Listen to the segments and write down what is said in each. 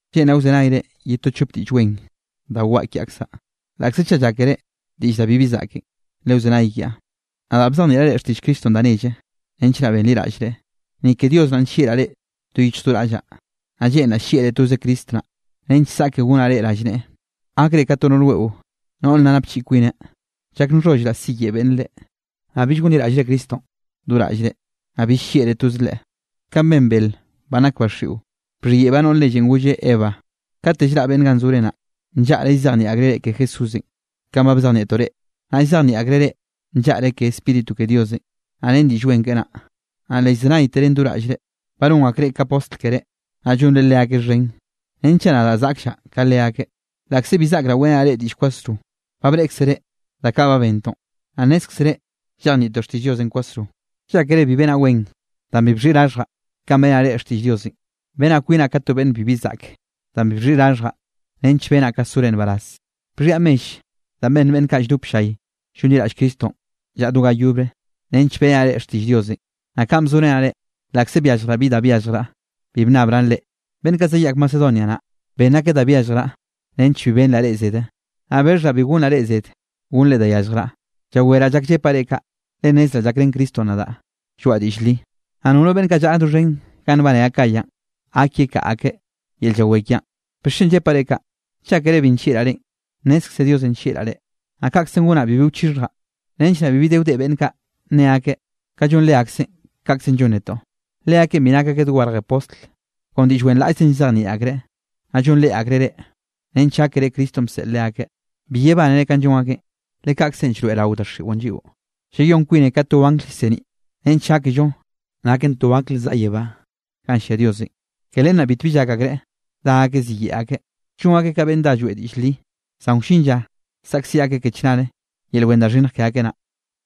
Lleꞌnraꞌ wzenayre ye to chop diꞌll wen da waꞌa kiaꞌkzaꞌ, laꞌkze chaꞌ llákere diꞌll da bibi zaꞌken. Lewzenay kiaꞌ. Nadaꞌ bzejnieꞌraꞌ reꞌ xtiꞌll Cristonꞌ da nelle nench naꞌ benliraꞌllre, ni ke Dios naꞌn nllieꞌraꞌ reꞌ do yichj do raꞌllaꞌ. Naꞌ lleꞌnraꞌ llieꞌre toze Cristo naꞌ, nench saꞌke gonaꞌ reꞌ rallneꞌe, gakre ka to noꞌr weꞌo, noꞌr nna napchiꞌi kwineꞌ. Llak nxhollraꞌ siyeꞌe beꞌnne reꞌ, naꞌ bill gonliraꞌllre Cristonꞌ do raꞌllre, naꞌ bill llieꞌre toze Leꞌe. Kaꞌn ben bel banꞌ nak ba xiꞌo, bxhiyeꞌbaꞌ noꞌr nellenꞌ golle Eva. Kate llraꞌ beꞌnne ganꞌ zore naꞌ, nllaꞌre llzejnieꞌ akreꞌ reꞌ ke Jesúsenꞌ kanꞌ ba bzejnieꞌ netoꞌ reꞌ, naꞌ llzejnieꞌ akreꞌ reꞌ nllaꞌre ke Spíritu ke Diosenꞌ, naꞌ ren Diꞌll Wen keꞌe naꞌ, naꞌ le llzenayteren do raꞌllre. Ba non akreꞌ ka postl keré, naꞌ llonre leakeꞌ xhen, renchaꞌ nadaꞌ zaꞌkllaꞌ ka leakeꞌ. Laꞌkze bi zaꞌkraꞌ weꞌrenaꞌ reꞌ diꞌll kwasro, ba breꞌkzere da kaꞌ ba bentoꞌn, naꞌ nnézkzere llejnieꞌtoꞌ xtiꞌll Diosenꞌ kwasro. ¿Llákere bi benaꞌ wen danꞌ bi bxhiꞌi raxhjaꞌ kanꞌ beꞌrenaꞌ reꞌ xtiꞌll Diosenꞌ? Benaꞌ kwinaꞌ ka to beꞌnn bibi zaꞌk, danꞌ bi bxhiꞌi raxhjaꞌ nench benaꞌ ka sore nbaraz. Bxhiaꞌ mell da benn beꞌnn kaꞌ lldop ll-llay llonliraꞌll Cristonꞌ llaꞌa do ga yobre nench beꞌrenaꞌ reꞌ xtiꞌll Diosenꞌ. Naꞌ kanꞌ bzorenaꞌ reꞌ, laꞌkze byalljraꞌ bi da byalljraꞌ, bi bnnabraꞌn reꞌ. Beꞌnn kaꞌ zayaꞌk Macedonia naꞌ, benn akeꞌ da byalljraꞌ nench bi benraꞌ reꞌ zede, naꞌ bexhaꞌ bi gonraꞌ reꞌ zed gonnre da yalljraꞌ. Llaweraꞌ llak llepaꞌ reꞌ kaꞌ, le nnezraꞌ llakrén Cristonꞌ nadaꞌ lloaꞌa diꞌll li, naꞌ nono beꞌnn kaꞌ llaꞌa doxhen ganꞌ nbane Acayanꞌ, gak yekaꞌa akeꞌ yel llawé kiaꞌn. ¿Bixchen llepaꞌ reꞌ kaꞌ? ¿Llákere bi nllieꞌraꞌ reꞌn? Nnezkze Diosenꞌ nllieꞌraꞌ reꞌ. Naꞌ kaꞌkze gonaꞌ bibi wchixhjaꞌ, nench naꞌ bibi de wdeꞌ beꞌnn kaꞌ nne akeꞌ, kanꞌ llon leakeꞌn kaꞌkzenꞌ llon netoꞌ. Leakeꞌn bi nak akeꞌ dogarje postl. Kon diꞌll wenraꞌllzenꞌ llzejnieꞌ akreꞌ, naꞌ llonreꞌ akreꞌ reꞌ, nench gákere Cristonꞌ bseꞌl leakeꞌ. Bi yebánere kanꞌ llon akeꞌn, le kaꞌkzenꞌ llroeꞌrao daxiꞌon lliꞌo, llayón kwinen ka to angl llseniꞌ, nench gákello naken to angl zaꞌa yebá ganꞌ llia Diosenꞌ. Ke len naꞌ bitbi llak akreꞌ dá akeꞌ ziyeꞌe akeꞌ, llon akeꞌ ka beꞌnn dá lloeꞌ diꞌll li, zan wllin lla, saꞌkziꞌ akeꞌ ke chnare yel wen da xhinnj ke akeꞌ naꞌ.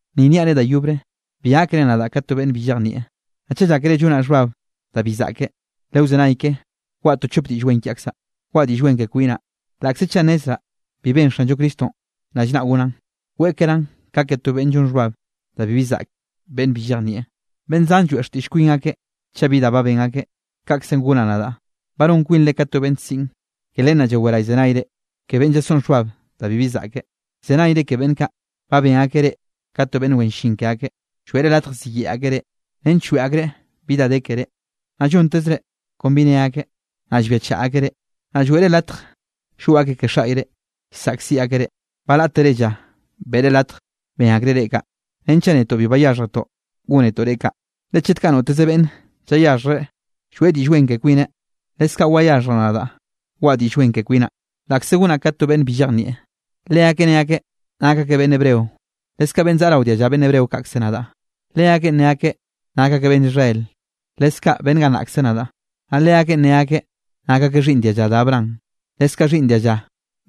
Ni niaꞌ reꞌ da yobre, bi gákere nadaꞌ ka to beꞌnn bi llejnieꞌ. Naꞌ chaꞌ llákere llonaꞌ xhbab da bi zaꞌke, lewzenay ke waꞌa to chop diꞌll wen kiaꞌkzaꞌ. Waꞌa diꞌll wen ke kwinaꞌ, laꞌkze chaꞌ nnezraꞌ bi benn Xanllo Cristonꞌ rallnaꞌ gonaꞌn. Weꞌkeraꞌn ka ke to beꞌnn llon xhbab da bibi zaꞌke, beꞌnn bi llejnieꞌ. Beꞌnn zan lloeꞌ xtiꞌll kwin akeꞌ chaꞌ bi da ba ben akeꞌ, kaꞌkzenꞌ gonaꞌ nadaꞌ. Ba non kwinre ka to beꞌnn siꞌn, ke len naꞌ llawere llzenayre ke beꞌnn llasoꞌn xhbab da bibi zaꞌkeꞌ. Llzenayre ke beꞌnn kaꞌ ba ben akeꞌ reꞌ ka to beꞌnn wen llin ke akeꞌ. Lloeꞌre latj ziyeꞌe akeꞌ reꞌ, nench lloeꞌ akreꞌ bi da de keré, naꞌ llontezre kon bi ne akeꞌ, naꞌ llbiachaꞌ akeꞌ reꞌ. Naꞌ lloeꞌre latj llgoꞌ akeꞌ ke xaꞌyre, llsaꞌkziꞌ akeꞌ reꞌ. Balátere lla beꞌre latj ben akreꞌ reꞌ kaꞌ, renchaꞌ netoꞌ bi bayáxhjetoꞌ gónetoꞌ reꞌ kaꞌ. Le chet kaꞌ noteze beꞌnne llayaxhjreꞌ lloeꞌ diꞌll wen ke kwineꞌ, leskaꞌ wayaxhjraꞌ nadaꞌ waꞌa diꞌll wen ke kwinaꞌ, laꞌkze gonaꞌ ka to beꞌnn bi llejnieꞌ. Leakeꞌ ne akeꞌ nak akeꞌ beꞌnn Hebreo, leskaꞌ beꞌnn zaꞌa rao dialla beꞌnn Hebreo kaꞌkze nadaꞌ. Leakeꞌ ne akeꞌ nak akeꞌ beꞌnn Israel, leskaꞌ beꞌnn gannaꞌkze nadaꞌ. Naꞌ leakeꞌ ne akeꞌ nak akeꞌ xhiꞌnn dialla da Abraham, leskaꞌ xhiꞌnn dialla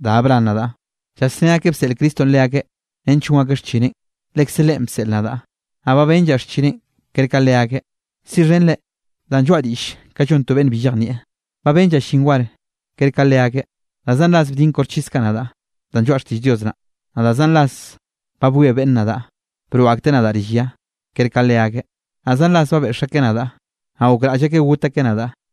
da Abraham nadaꞌ. Llasné akeꞌ bseꞌl Cristonꞌ leakeꞌ nench gon akeꞌ xchineꞌn. Lekze Leꞌen bseꞌl nadaꞌ, naꞌ ba benllaꞌ xchineꞌn ker ka leakeꞌ. Siꞌxhenre danꞌ lloaꞌa diꞌll ka llon to beꞌnn bi llejnieꞌ. Ba benllaꞌ llin war ker ka leakeꞌ, da zan ras bdin koxchis nadaꞌ danꞌ lloaꞌa xtiꞌll Dios naꞌ. Naꞌ zan ras ba bwie beꞌnne nadaꞌ broꞌ akteꞌ nadaꞌ rill ya, ker ka leakeꞌ. Naꞌ zan ras ba beꞌx akeꞌ nadaꞌ, naꞌ gokraꞌll akeꞌ got akeꞌ nadaꞌ.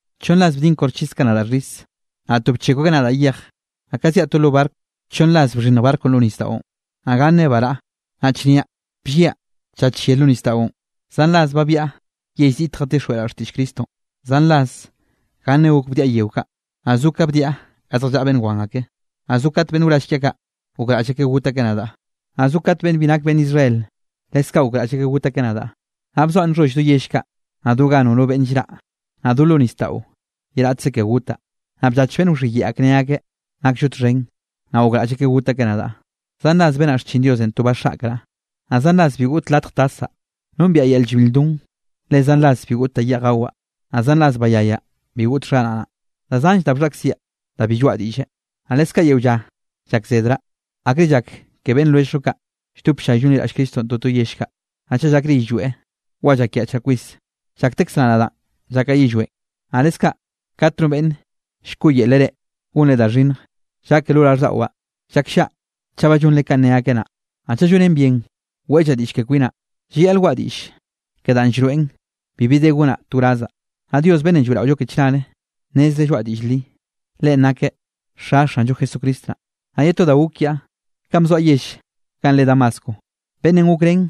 Chonn ras bdin koxchis kaꞌ nadaꞌ xhis. Naꞌ to bchekw akeꞌ nadaꞌ yej. Naꞌ ka zyaꞌ to lo barco, chonn ras bxhinnj barconꞌ lo nisdaꞌon, naꞌ ganne baraꞌa. Naꞌ chnia blliaꞌ tlla chyere lo nisdaꞌon. Zan ras ba byaꞌa yell ziꞌte jatixjweꞌraꞌ xtiꞌll Cristonꞌ. Zan ras ganne gok bdiaꞌ yeo kaꞌ, naꞌ zo ka bdiaꞌ ga zjallaꞌa beꞌnn wan ake, naꞌ zo kat beꞌnn wraꞌll kiaꞌ kaꞌ gokraꞌll akeꞌ got akeꞌ nadaꞌ, naꞌ zo kat beꞌnn bi nake beꞌnn Israel, leskaꞌ gokraꞌll akeꞌ got akeꞌ nadaꞌ. Naꞌ bzoaꞌ nxholl do yell kaꞌ, naꞌ do ga nono beꞌnn llraꞌ, naꞌ do lo nisdaꞌo ye raꞌtze ke gotaꞌ. Naꞌ bllach beꞌnn bxhiyeꞌe akeꞌ ne akeꞌ: “Nakllo txhen,” naꞌ gokraꞌll akeꞌ got akeꞌ nadaꞌ. Zan ras benaꞌ xchin Diosenꞌ to baxaꞌkraꞌ, naꞌ zan ras bi goꞌt latj tasaꞌ. Nombiaꞌ yel llbil lldon, le zan ras bi goꞌt da yeꞌj gawaꞌ. Naꞌ zan ras bayayaꞌ bi goꞌt xharaꞌnaꞌ. Da zanllre da bxhaꞌkziaꞌ da bi lloaꞌa diꞌlle, naꞌ leskaꞌ yeo lla llakzedraꞌ, akre llak ke beꞌnn lwelljllo kaꞌ lldop ll-llay llonliraꞌll Cristonꞌ toto yell kaꞌ. Naꞌ chaꞌ llakre yillweꞌ, wa llakyaꞌchraꞌ kwis, llaktekzeraꞌ nadaꞌn llakaꞌ yillweꞌn. Naꞌ leskaꞌ kat no beꞌnn llkoꞌyelreꞌ reꞌ gonre da xhinnj, llake lo raꞌlldaꞌwaꞌ, llakllaꞌa chaꞌ ba llonre kanꞌ ne akeꞌ naꞌ. Naꞌ chaꞌ llonen bien weꞌllaꞌ diꞌll ke kwinaꞌ, llayaꞌl waꞌa diꞌll ke danꞌ llroeꞌn bibi de gonaꞌ to wrazaꞌ. Naꞌ Dios beꞌnnenꞌ lloeꞌraollo ke chnare, nnezreꞌ lloaꞌa diꞌll li. Leꞌen nakeꞌ Xa Xanllo Jesucristo naꞌ. Naꞌ ye to da gok kiaꞌ, kanꞌ bzoaꞌ yell ganꞌ re Damasco, beꞌnnenꞌ gokrén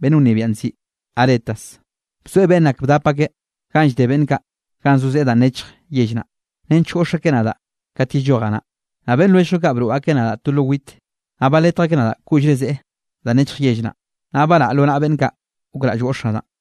beꞌnn wnebiaꞌn nziꞌi Aretas, bzoeꞌ beꞌnn ak bdap akeꞌ ganꞌ llde beꞌnn kaꞌ ganꞌ zo zeꞌe danꞌ nechj yell naꞌ, nench goꞌx akeꞌ nadaꞌ kate yellojaꞌ naꞌ. Naꞌ beꞌnn lwelljllo kaꞌ broꞌ akeꞌ nadaꞌ to lo wit, naꞌ baletj akeꞌ nadaꞌ koꞌllre zeꞌe danꞌ nechj yell naꞌ, naꞌ baraꞌa lo naꞌa beꞌnn kaꞌ gokraꞌll goꞌx nadaꞌ.